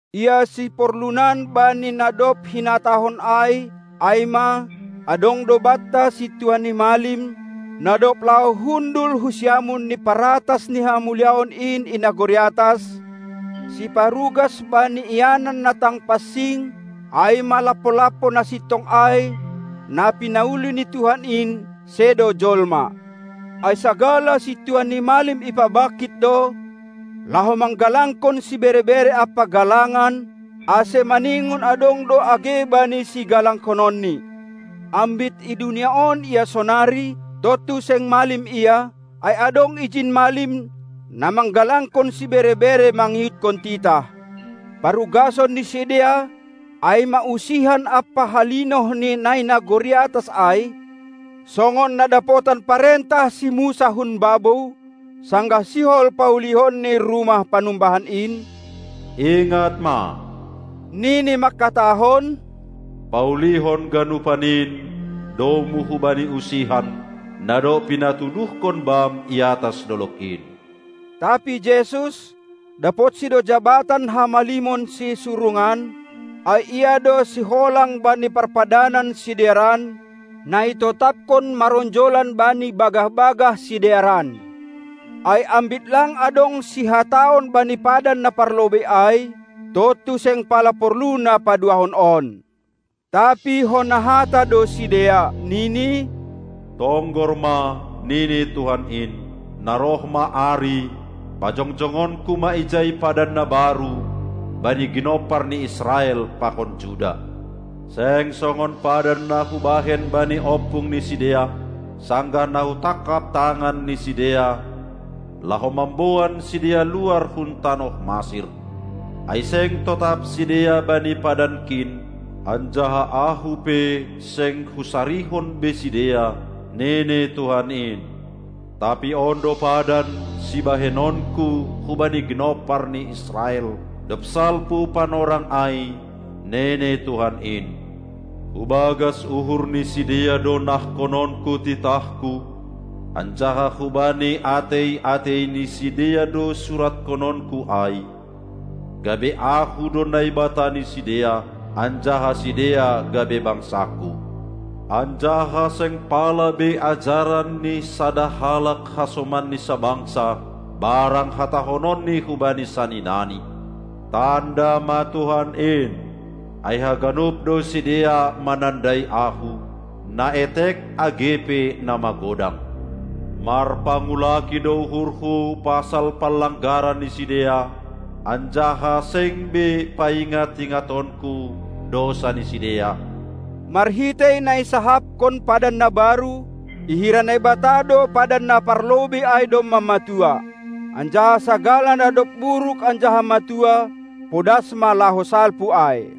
Ia siporlunan bani na dob hinatahon ai, ai ma: Adong do banta Sintua ni malim, na dob laho hundul hu siamun ni paratas ni Hamuliaon in i nagori atas, siparugas bani ianan na tang pansing, ai ma lampo-lampo na sintong ai, na pinauli ni Tuhan in, sedo jolma. Ai sagala sintua ni malim ipabangkit do, laho manggalangkon sibere-bere ampa galangan; ase maningon adong do age Bani sigalanghononni. Ambit i dunia on Ia sonari, tontu seng malim Ia, ai adong ijin malim, na manggalangkon sibere-bere mangihutkon titah. Parugason ni sidea ai ma usihan ampa halinoh ni na i nagori atas ai, songon na dapotan parentah si Musa hun babou, sanggah sihol paulionni rumah panumbahan in: "Ingat ma," nini mangkatahon, "paulihon ganupan in domu hubani usihan, na dob pinatuduhkon bam iatas dolog in!" Tapi Jesus, dapotsi do jabatan hamalimon sisurungan, ai Ia do siholang bani parpadanan sidearan, na itotapkon maronjolan bani bagah-bagah sidearan. Ai ambit lang adong sihataon bani padan na parlobei ai, tontu seng pala porlu na paduahon on. Tapi hona hata do sidea, nini: "Tonggor ma, nini Tuhan in, na roh ma ari, pajongjongonku ma ijai padan na baru bani ginompar ni Israel pakon Juda!" Seng songon padan na hubahen bani ompung ni sidea, sanggah na hutangkap tangan ni sidea, laho mamboan sidea luar hun tanoh Masir; ai seng totap sidea bani padanKin, anjaha Ahu pe seng husarihon be sidea, nini Tuhan in. Tapi on do padan, sibahenonKu hubani ginompar ni Israel, dob salpu panorang ai, nini Tuhan in: Hubagas uhur ni sidea do nahkononKu titahKu, anjaha hubani atei-atei ni sidea do surathononKu ai, gabe Ahu do Naibata ni sidea, anjaha sidea gabe bangsangKu. Anjaha seng pala be ajaran ni sada halak hasomanni sabangsa barang hatahononni hubani saninani: "Tanda ma Tuhan in," ai haganup do sidea manandai Ahu, na etek age pe na magodang. Marpangulaki do uhurhu pasal panlanggaran ni sidea, anjaha seng be paingat-ingatonku dousa ni sidea. Marhitei na isahapkon padan na baru, ihira Naibata do padan na parlobei ai domma matua. Anjaha sagala na dob buruk anjaha matua, podas ma laho salpu ai.